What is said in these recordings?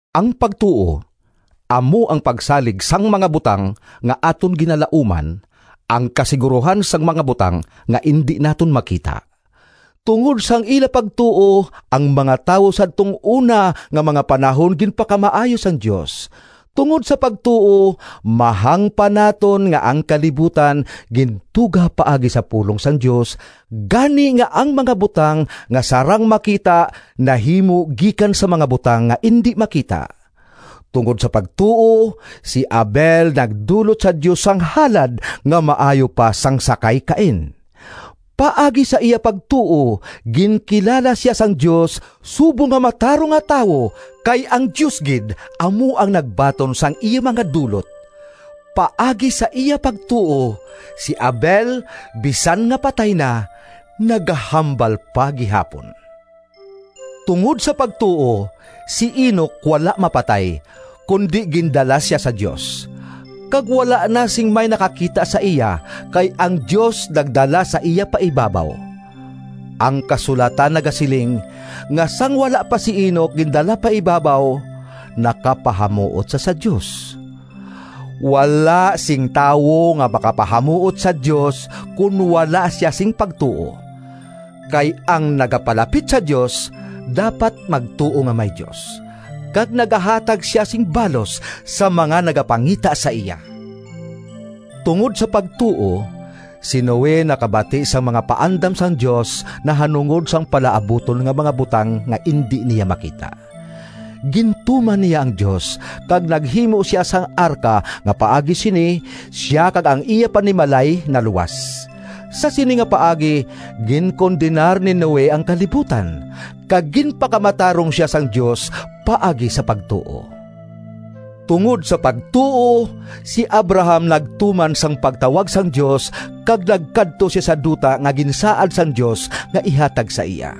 Ang pagtuo amo ang pagsalig sang mga butang nga aton ginalauman, ang kasigurohan sang mga butang nga indi naton makita. Tungod sang ila pagtuo, ang mga tawo sadtong una nga mga panahon ginpakamaayo sang Dios. Tungod sa pagtuo, mahangpan naton nga ang kalibutan gintuga paagi sa pulong sang Dios, gani nga ang mga butang nga sarang makita nahimo gikan sa mga butang nga indi makita. Tungod sa pagtuo, si Abel nagdulot sa Dios sang halad nga maayo pa sang sa kay Cain. Paagi sa iya pagtuo, ginkilala sia sang Dios subong nga matarong nga tawo, kay ang Dios gid amo ang nagbaton sang iya mga dulot. Paagi sa iya pagtuo, si Abel bisan nga patay na, nagahambal pa gihapon. Tungod sa pagtuo, si Enoc wala mapatay kundi gindala sia sa Dios, kag wala na sing may nakakita sa iya, kay ang Dios nagdala sa iya pa ibabaw. Ang kasulatan nagasiling nga sang wala pa si Enoc gindala pa ibabaw, nakapahamuot sia sa Dios. Wala sing tawo nga makapahamuot sa Dios kon wala sia sing pagtuo. Kay ang nagapalapit sa Dios dapat magtuo nga may Dios, kag nagahatag sia sing balos sa mga nagapangita sa iya. Tungod sa pagtuo, si Noe nakabati sang mga paandam sang Dios nahanungod sang palaabuton nga mga butang nga indi niya makita. Gintuman niya ang Dios, kag naghimo sia sang arka nga paagi sini, sia kag ang iya panimalay naluwas. Sa sini nga paagi, ginkondenar ni Noe ang kalibutan, kag ginpakamatarong sia sang Dios paagi sa pagtuo. Tungod sa pagtuo, si Abraham nagtuman sang pagtawag sang Dios, kag nagkadto sia sa duta nga ginsaad sang Dios nga ihatag sa iya.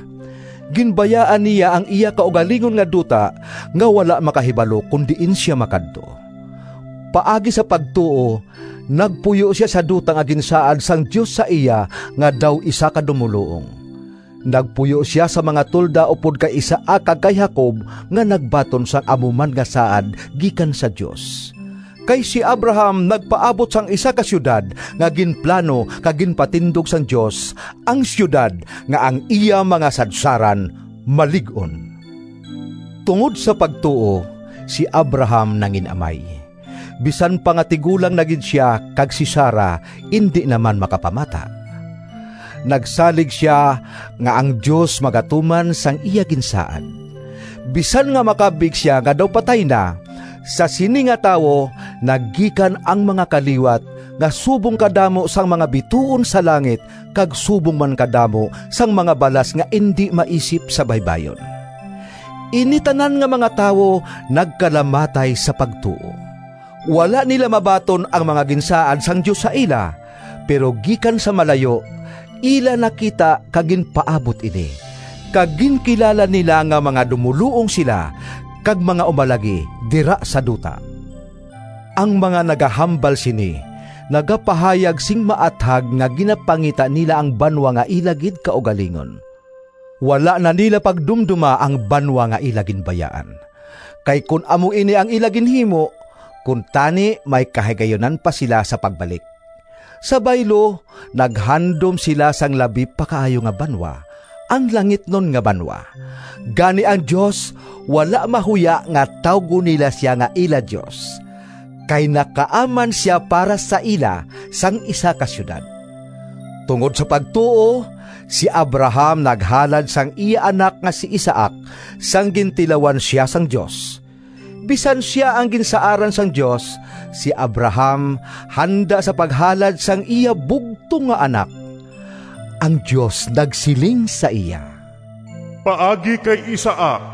Ginbayaan niya ang iya kaugalingon nga duta nga wala makahibalo kon diin sia makadto. Paagi sa pagtuo nagpuyo sia sa duta nga ginsaad sang Dios sa iya, nga daw isa ka dumoluong. Nagpuyo sia sa mga tolda upod kay Isaac kag kay Jacob nga nagbaton sang amo man nga saad gikan sa Dios. Kay si Abraham nagpaabot sang isa ka siyudad nga ginplano kag ginpatindog sang Dios, ang siyudad nga ang iya mga sadsaran malig-on. Tungod sa pagtuo, si Abraham nangin-amay, bisan pa nga tigulang na gid sia kag si Sara indi naman makapamata. Nagsalig sia nga ang Dios magatuman sang iya ginsaad. Bisan nga makabig sia nga daw patay na, sa sini nga tawo nagikan ang mga kaliwat nga subong kadamo sang mga bituon sa langit, kag subong man kadamo sang mga balas nga indi maisip sa baybayon. Ini tanan nga mga tawo nagkalamatay sa pagtuo. Wala nila mabaton ang mga ginsaad sang Dios sa ila, pero gikan sa malayo ila nakita kag ginpaabot ini, kag ginkilala nila nga mga dumoluong sila kag mga umalagi dira sa duta. Ang mga nagahambal sini nagapahayag sing maathag nga ginapangita nila ang banwa nga ila gid kaugalingon. Wala na nila pagdumdoma ang banwa nga ila ginbayaan, kay kon amo ini ang ila ginhimo, kuntani may kahigayunan pa sila sa pagbalik. Sa baylo, naghandom sila sang labi pa kaayo nga banwa, ang langitnon nga banwa. Gani ang Dios wala mahuya nga tawgon nila sia nga ila Dios, kay nakaaman sia para sa ila sang isa ka siyudad. Tungod sa pagtuo, si Abraham naghalad sang iya anak nga si Isaac, sang gintilawan sia sang Dios. Bisan sia ang ginsaaran sang Dios, si Abraham handa sa paghalad sang iya bugtong nga anak. Ang Dios nagsiling sa iya, “Paagi kay Isaac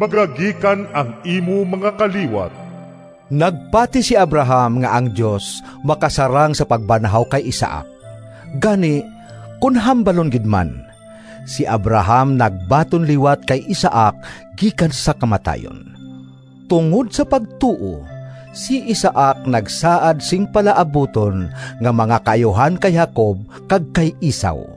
magagikan ang imo mga kaliwat.” Nagpati si Abraham nga ang Dios makasarang sa pagbanhaw kay Isaac—gani, kon hambalon gid man si Abraham nagbaton liwat kay Isaac gikan sa kamatayon. Tungod sa pagtuo, si Isaac nagsaad sing palaabuton nga mga kaayuhan kay Jacob kag kay Esau.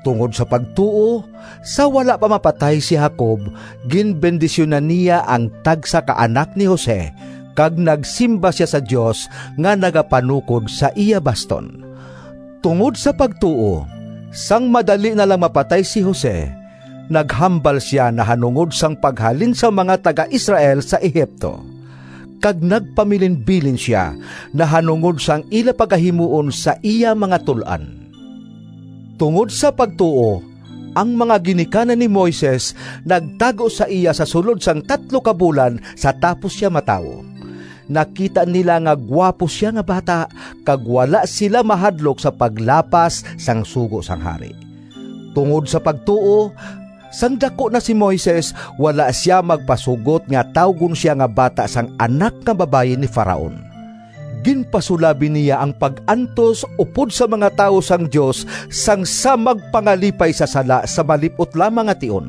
Tungod sa pagtuo, sa wala pa mapatay si Jacob ginbendisyunan niya ang tagsa ka anak ni Jose, kag nagsimba sia sa Dios nga nagapanukod sa iya baston. Tungod sa pagtuo, sang madali na lang mapatay si Jose naghambal sia nahanungod sang paghalin sang mga taga-Israel sa Egipto, kag nagpamilinbilin sia nahanungod sang ila pagahimuon sa iya mga tul-an. Tungod sa pagtuo, ang mga ginikanan ni Moises nagtago sa iya sa sulod sang tatlo ka bulan sa tapos sia matawo. Nakita nila nga guwapo sia nga bata, kag wala sila mahadlok sa paglapas sang sugo sang hari. Tungod sa pagtuo, sang daku na si Moises, wala sia magpasugot nga tawgon sia nga bata sang anak nga babayi ni Faraon. Ginpasulabi niya ang pag-antos upod sa mga tawo sang Dios sang sa magpangalipay sa sala sa malip-ot lamang nga tion.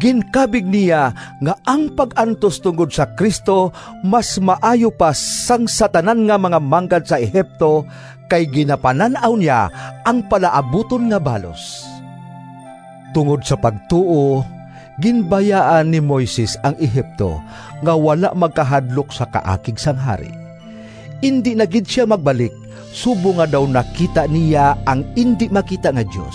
Ginkabig niya nga ang pag-antos tungod si Cristo mas maayo pa sang sa tanan nga mga manggad sa Egipto, kay ginapanan-aw niya ang palaabuton nga balos. Tungod sa pagtuo, ginbayaan ni Moises ang Egipto nga wala magkahadlok sa kaakig sang hari. Indi na gid sia magbalik, subong nga daw nakita niya ang indi makita nga Dios.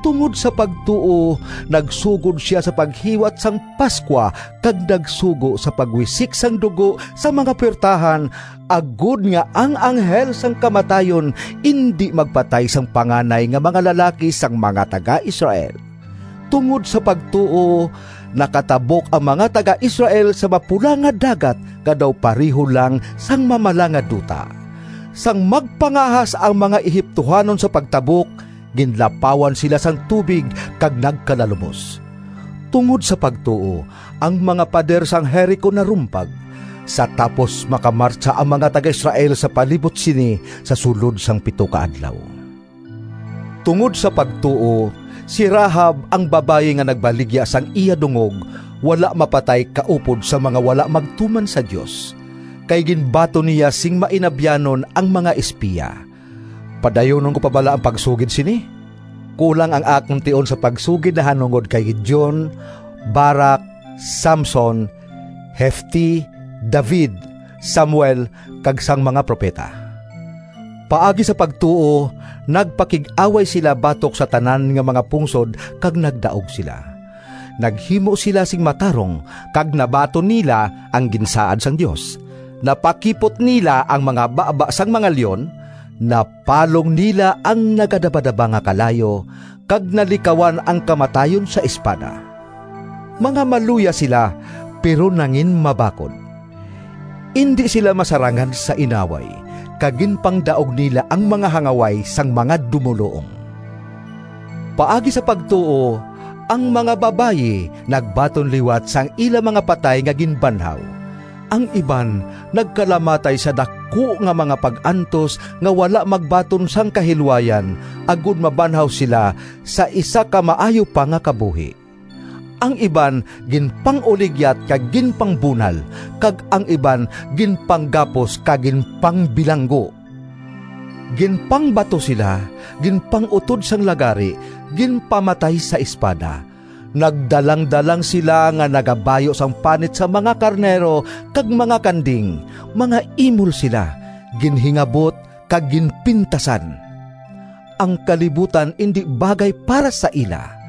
Tungod sa pagtuo nagsugod sia sa paghiwat sang Pascua kag nagsugo sa pagwisik sang dugo sa mga puwertahan, agod nga ang Anghel sang Kamatayon indi magpatay sang panganay nga mga lalaki sang mga taga-Israel. Tungod sa pagtuo, nakatabok ang mga taga-Israel sa Mapula nga Dagat nga daw pareho lang sang mamala nga duta. Sang magpangahas ang mga Egiptohanon sa pagtabok, ginlapawan sila sang tubig, kag nagkalalumos. Tungod sa pagtuo, ang mga pader sang Jerico narumpag, sa tapos makamartsa ang mga taga-Israel sa palibot sini sa sulod sang pito ka adlaw. Tungod sa pagtuo, si Rahab, ang babayi nga nagbaligya sang iya dungog, wala mapatay kaupod sa mga wala magtuman sa Dios, kay ginbaton niya sing mainabyanon ang mga espiya. Padayunon ko pa bala ang pagsugid sini? Kulang ang akon tion sa pagsugid nahanungod kay Gideon, Barac, Samson, Jefte, David, Samuel kag sang mga propeta. Paagi sa pagtuo nagpakig-away sila batok sa tanan nga mga pungsod kag nagdaog sila. Naghimo sila sing matarong kag nabaton nila ang ginsaad sang Dios. Napakipot nila ang mga baba sang mga leon, napalong nila ang nagadabadaba nga kalayo, kag nalikawan ang kamatayon sa espada. Mga maluya sila pero nanginmabakod. Indi sila masarangan sa inaway, kag ginpangdaog nila ang mga hangaway sang mga dumoluong. Paagi sa pagtuo, ang mga babayi nagbaton liwat sang ila mga patay nga ginbanhaw. Ang iban nagkalamatay sa daku nga mga pag-antos nga wala magbaton sang kahilwayan, agod mabanhaw sila sa isa ka maayo pa nga kabuhi. Ang iban ginpanguligyat kag ginpangbunal, kag ang iban ginpanggapos kag ginpangbilanggo. Ginpangbato sila, ginpang-utod sang lagari, ginpamatay sa espada. Nagdalangdalang sila nga nagabayu sang panit sang mga karnero kag mga kanding, mga imol sila, ginhingabot, kag ginpintasan. Ang kalibutan indi bagay para sa ila!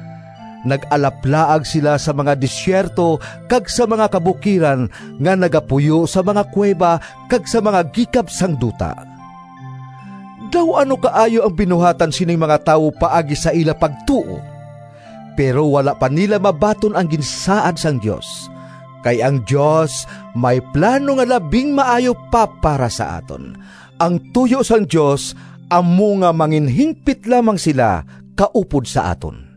Nag-alaplaag sila sa mga desierto kag sa mga kabukiran, nga nagapuyo sa mga kuweba, kag sa mga gikab sang duta. Daw ano kaayo ang binuhatan sining mga tawo paagi sa ila pagtuo! Pero wala pa nila mabaton ang ginsaad sang Dios, kay ang Dios may plano nga labing maayo pa para sa aton. Ang tuyo sang Dios amo nga manginhimpit lamang sila kaupod sa aton.